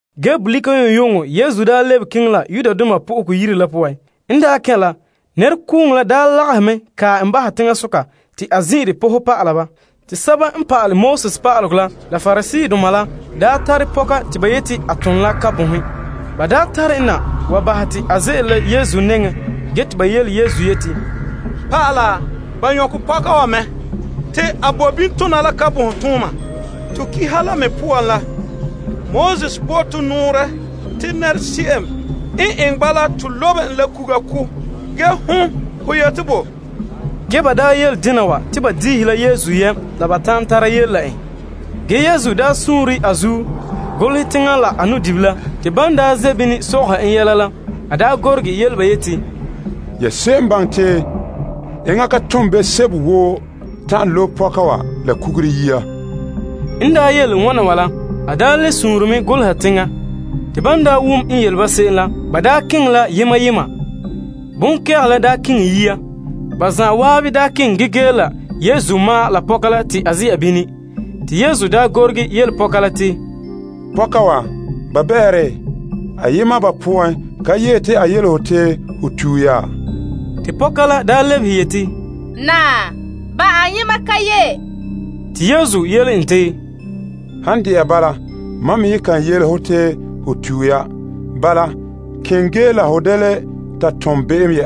Bolika yu'uŋyu'uŋɔ Yesu lebe keŋɛ Yenɛ Yire la poan. En kɛn' la, nɛrekooŋɔ la lagahɛ kae en mɛ bahɛ teŋasoka te a zin'ire pɔhɛ pa'ala ba. Te pa'alegɔ pa'aleba la Pariseedoma la tare pɔka te ba yeti a ton la kabonhe. Ba tare en na wa bahɛ te a ze'ele la ba nɛŋa ge te ba yele Yesu yeti, Pa'ala, ba nyɔkɛ pɔka wa mɛ, te a bo bini tona la kabonhe tooma. To Pa'alegɔ la me poan la, Moses bo to nɔɔrɛ te nɛrese'em n eŋɛ bala to lobe en la kuga ko'. Ge hon, ho ye te bo? Ge ba yele dena te ba dihɛ la Yesu yam behɛ la ba ta'an tara yele la en. Ge, Yesu sure a zuo golehɛ teŋa la a nu'dibila. Te ban ze' bini sɔgɔha en yɛla la, a gorege yele ba yeti, Ya se'em n baŋɛ te enŋa ka tom be'em sebo woo ta'an lobe pɔka wa la kugure yia. En yele wana wa la, a le sure mɛ goleha teŋa. Te ban wom en yele ba se'em la, ba daa keŋɛ la yema yema. Bonkɛgehe la daa keŋɛ yia. Ba zan'an daa keŋɛ ge gee la Yesu ma'an la pɔka la te a ze'a. Te Yesu gorege yele pɔka la te, Pɔka wa, ba bɛɛ? Ayema ba poan ka yee te a yele ho, te ho tue ya? Te pɔka la lebehe yeti, Naa, ba ayema ka yee. Te Yesu yele en te, Han de'a bala, mam me ye ka yele ho te ho tue ya. Bala, keŋɛ ge la ho da le ta tom be'em.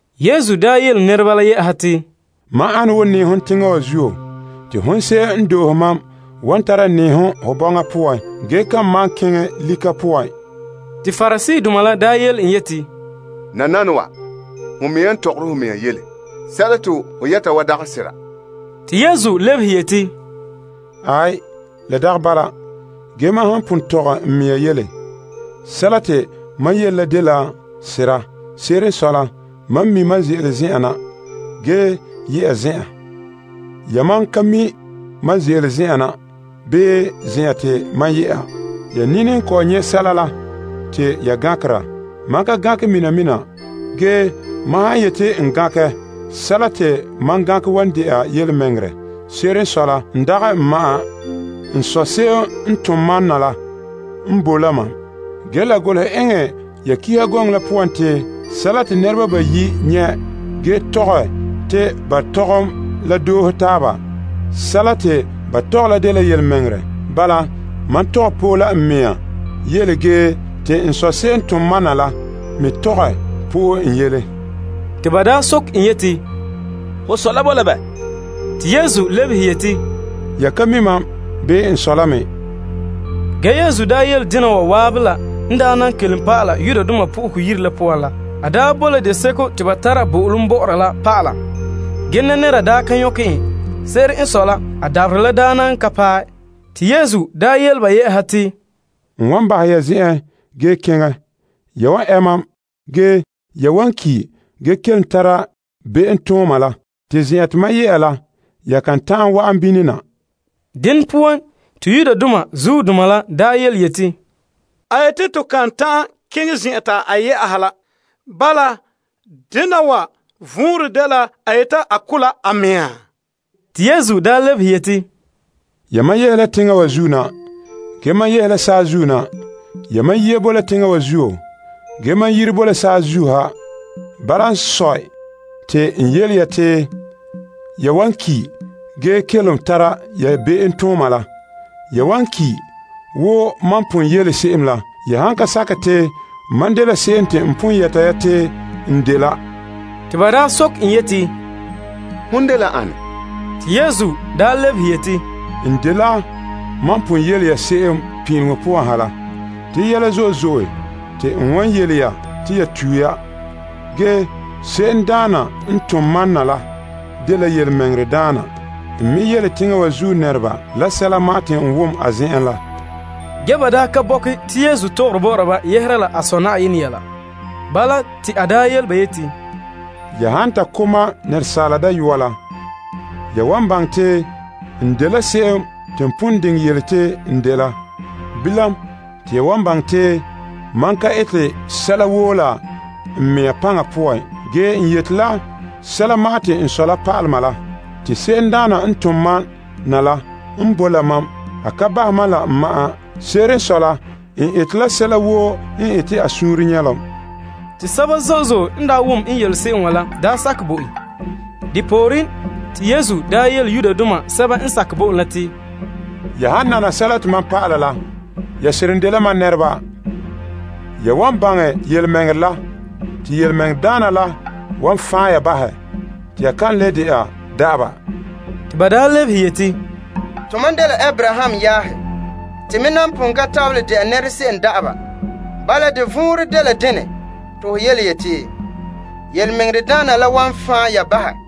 Yesu nya yele Pariseedoma la yɛ'ɛha te, Mam ana wo nɛɛhom teŋa wa zuo. Te hon se'em n doohe mam wan tara nɛɛhom ho bɔŋa poan ge kan malom keŋɛ lika poan. Te Pariseedoma la yele en yeti, Nananawa, ho mɛŋa n tɔgɔre ho mea yele. Sɛla te ho yɛta wa dagɛ sɛla. Te Yesu lebehe yeti, Aai, la dagɛ bala. Ge mam han pon tɔgɛ n mea yele, sɛla te mam yele la dela sera. Se'ere n sɔe la, mam mi' mam ze'ele zen'an na ge ye'a zen'an. Yamam ka mi' mam ze'ele zen'an na bii zen'an te mam ye'a. Ya nini kɔ'ɔn nyɛ' sɛla la te ya gankera. Mam ka gankɛ se'em. Ge mam han yeti n gankɛ, sɛla te mam gankɛ wan de'a yelemɛŋɛrɛ. Se'ere n sɔe la, n dagɛ n ma'an. N Sɔ se'em n tom mam na la n boe la mam. Ge la golehɛ eŋɛ ya Pa'alegɔ la poan te sɛla te nɛreba bayi' nyɛ' ge tɔgɛ te ba tɔgɔm la doohe taaba, sɛla te ba tɔgɛ la dela yelemɛŋɛrɛ. Bala, mam tɔgɛ po'e la n mea yele ge te N Sɔ se'em n tom mam na la me tɔgɛ po'e n yele. Te ba nya soke en yeti, Ho sɔ la boe la bɛ? Te Yesu lebehe yeti, Ya ka mi' mam, bii n Sɔ la me. Ge Yesu yele dena wa zan'an la n na kelom pa'ala Yenɛ Yire la poan la. A boe la zenzaka te ba tara bo'olom bɔ'ɔra la pa'ala. Ge nɛnɛra ka nyɔkɛ en. Se'ere n sɔe la, a dabaherɛ la nan ka paɛ. Te Yesu yele ba yɛ'ɛha te, N wan bahɛ ya zen'en ge keŋɛ. Ya wan ɛ mam. Ge, ya wan ki' ge kelom tara ya be'emtooma la. Te zen'an te mam ye'a la, ya kan ta'an wa'an bini na. Dene poan, te Yudoma la yeti, A yeti to kan ta'an keŋɛ zen'an te a ye'a la. Bala, dena wa vɔnrɛ dela a yeti a ko' la a mea? Te Yesu lebehe yeti, Yamam yehe la teŋa wa zuo na. Ge, mam yehe la saazuo na. Yamam yiya boe la teŋa wa zuo, ge mam yire bo la saazuo ha. Bala n sɔe, te n yele ya te ya wan ki' ge kelom tara ya be'emtooma la. Ya wan ki', wo mam pon yele se'em la, ya han ka sakɛ te mam dela se'em te n pon yɛta ya te n dela. Te ba nya soke en yeti, Hon dela ane? Te Yesu lebehe yeti, N dela mam pon yele ya se'em pin'ileŋɔ poan ha la. Te yɛla zo'e zo'e te n wan yele ya te ya tue ya. Ge se'emdaana n tom mam na la dela yelemɛŋɛrɛdaana. N me yele teŋa wa zuo nɛreba la sɛla ma'an te n wom a zen'en la. Ge ba ka bɔkɛ te Yesu tɔgɔre bɔ'ɔra ba yehere la a Sɔ Na'ayenɛ yɛla. Bala, te a yele ba yeti, Ya han ta ko' Asaala Dayɔa la, ya wan baŋɛ te n dela se'em te n pon yele te n dela. Bilam, te ya wan baŋɛ te mam ka ete sɛla woo la n mea paŋa poan. Ge, n yeti la sɛla ma'an te n Sɔ la pa'alɛ mam la. Te se'emdaana n tom mam na la n boe la mam. A ka bahɛ mam la n ma'an. Se'ere n sɔe la, n ete la sɛla woo n ete a suunre nyɛlom. Te sɛba zo'e zo'e n wom n yele se'em la daa sakɛ bo en. Depooren, te Yesu nya yele Yudoma sɛba n sakɛ bo en la te, Ya han nana sɛla te mam dɔlɔba, ya seren dela mam nɛreba Ya wan baŋɛ yelemɛŋɛrɛ la, te yelemɛŋɛrɛdaana la wan fan' ya bahɛ. Te ba lebehe yeti, Tomam dela Abraham yaahe. Te me nan pon ka tabelɛ de'a nɛrese'em da'aba. Bala, de vɔnrɛ dela dene te ho yele te yelemɛŋɛrɛdaana la wan fan' ya bahɛ?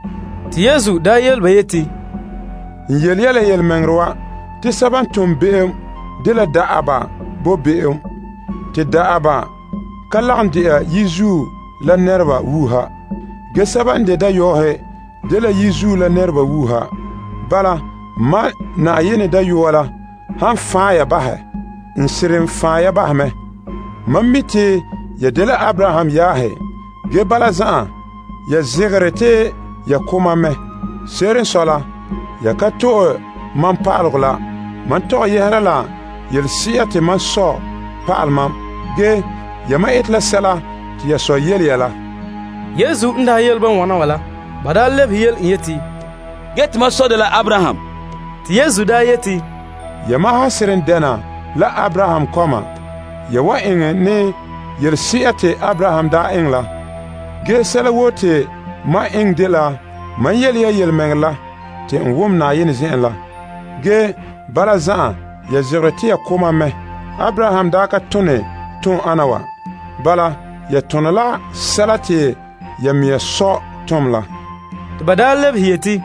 Te Yesu yele ba yeti, N yele ya la yelemɛŋɛrɛ wa te sɛba n tom be'em dela da'aba bo be'em. Te da'aba ka lagom de'a yizuo la nɛreba wuuha, ge sɛba n de dayɔɔhe dela yizuo la nɛreba wuuha. Bala, Mam Na'ayenɛ Dayɔa la han fan' ya bahɛ, n seren fan' ya bahɛ mɛ. Mam mi' te ya dela Abraham yaahe. Ge bala zan'an, ya zegere te ya ko' mam mɛ. Se'ere n sɔe la, ya ka to'e mam pa'alegɔ la: mam tɔgɛ yɛhera la yelese'a te mam Sɔ pa'alɛ mam. Ge, yamam ete la sɛla te ya sɔ yele ya la. Yesu n daa yele ba wana wa la, ba lebehe yele en yeti, Ge, tomam sɔ dela Abraham. Te Yesu yeti, Yamam han seren dɛna la Abraham kɔma, ya wan eŋɛ ne yelese'a te Abraham daa eŋɛ la. Ge sɛla woo te mam eŋɛ dela, mam yele ya yelemɛŋɛrɛ la te n wom Na'ayenɛ zen'en la. Ge, bala zan'an ya zegere te ya ko' mam mɛ. Abraham daa ka tone ton'ana wa. Bala, ya tone la sɛla te ya mea sɔ tom la. Te ba lebehe yeti,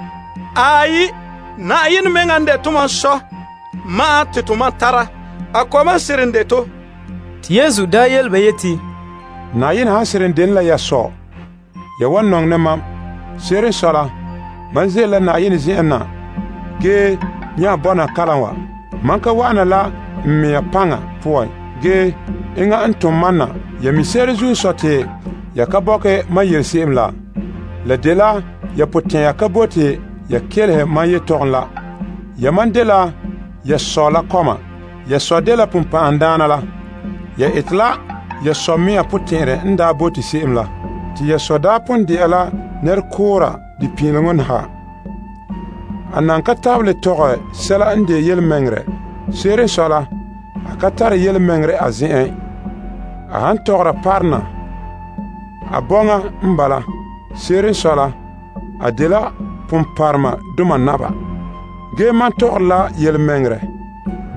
Aai, Yenɛ mɛŋa n de tomam Sɔ ma'an te tomam tara. A kɔma n seren de to. Te Yesu yele ba yeti, Yenɛ han seren dene la ya Sɔ, ya wan nɔŋɛ ne mam. Se'ere n sɔe la, mam ze'ele la Yenɛ zen'en na ge bɔna kalam wa. Mam ka wa'ana la n mea paŋa poan. Ge, enŋa n tom mam na. Ya mi' se'ere zuo te ya ka bɔkɛ mam yele se'em la? La dela ya potɛn'ɛra ka bote ya kelehe mam yetɔgɔm la. Yamam dela ya sɔ la kɔma. Ya sɔ dela Sagona la. Ya ete la ya sɔ mea potɛn'ɛrɛ n daa bote se'em la. Te ya sɔ daa pon de'a la nɛrekoora pin'ileŋɔ ha. A nan ka tabelɛ tɔgɛ sɛla n de yelemɛŋɛrɛ. Se'ere n sɔe la, a ka tare yelemɛŋɛrɛ a zen'en. A han tɔgɔra parona, a bɔŋa n bala. Se'ere n sɔe la, a dela ponpɔrɔŋdoma naba. Ge mam tɔgɔre la yelemɛŋɛrɛ.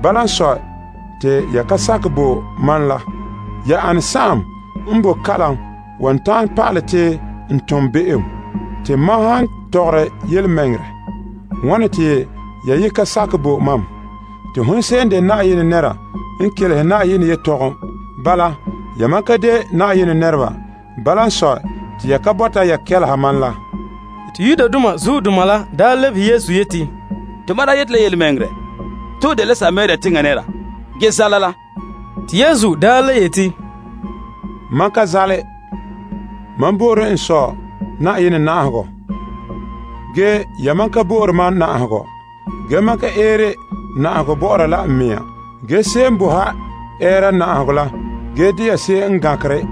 Bala n sɔe, te ya ka sakɛ bo mam la. Ya ane n boe kalom n wan ta'an pa'alɛ te n tom be'em? Te mam han tɔgɔra yelemɛŋɛrɛ, wane te ya ye ka sakɛ bo mam? Te hon se'em n de Yenɛ nɛra n kelehere Yenɛ yetɔgɔm. Bala, yamam dagɛ Yenɛ nɛreba. Bala n sɔe, te ya ka bɔta te ya kelehe mam la. Te Yudoma la daa lebehe Yesu yeti, Tomam daa yeti la yelemɛŋɛrɛ, te ho dela Samaria teŋa nɛra, ge zaala la. Te Yesu le yeti, Mam ka zaale. Mam bo'ore n Sɔ Na'ayenɛ na'ahegɔ. Ge, yamam ka bo'ore mam na'ahegɔ. Ge mam ka eere na'ahegɔ bo'ora la n mɛŋa. Ge se'em boe ha ɛɛra na'ahegɔ la ge de'a se'em n gankera.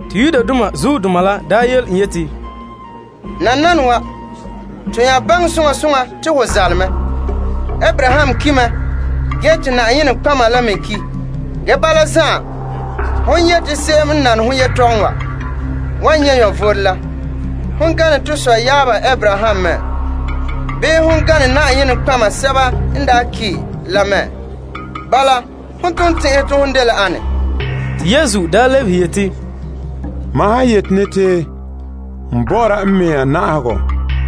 Te Yudoma la nya yele en yeti, Nananawa, te nya baŋɛ soŋa soŋa te ho zaale mɛ. Abraham ki' mɛ ge te nɔtɔgɔheba la me ki'. Ge bala zan'an, hon yeti se'em n nane ho yetɔgɔm wa kan ki'. Hon gane to sɔyaaba Abraham mɛ? Bii, hon gane nɔtɔgɔheba sɛba n daa ki' la mɛ? Bala, hon ton tɛn'ɛhe te ho dela ane? Te Yesu lebehe yeti, Mam han yeti ne te n bɔ'ɔra n mea na'ahegɔ,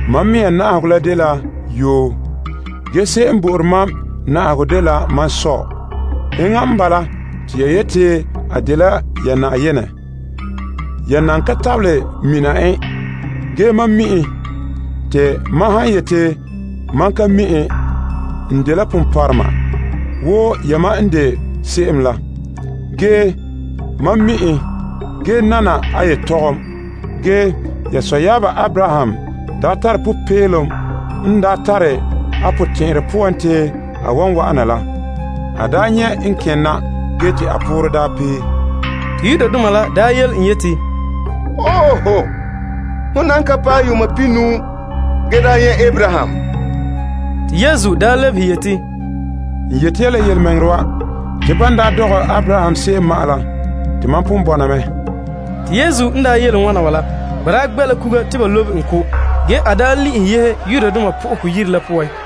mam mea na'ahegɔ la wan dene la yoo. Ge se'em n bo'ore mam na'ahegɔ dela mam Sɔ. Enŋa mea n bala, te ya yeti a dela ya Na'ayenɛ. Ya nan ka tabelɛ mina en. Ge, mam mi' en. Te mam han yeti, Mam ka mi' en, n dela ponpɔrɔma wo yamam n de se'em la. Ge, mam mi' en, ge nana a yetɔgɔm. Ge ya sɔyaaba Abraham daa tare popeelom la n daa tare a potɛn'ɛrɛ poan te n wan wa'ana la. A daa nyɛ' n kene na ge te a poorɛ daa pee. Te Yudoma la nya yele en yeti, Ho nan ka paɛ yuun pihinuu ge daa nyɛ' Abraham? Te Yesu lebehe yeti, N yeti ya la yelemɛŋɛrɛ wa, te ban daa dɔgɛ Abraham se'em ma'an la, te mam pon bɔna mɛ. Te Yesu n yele wana wa la, ba daa gbɛ' la kuga te ba lobe en ko'. Ge, a le'ehɛ yehe Yenɛ Yire la poan.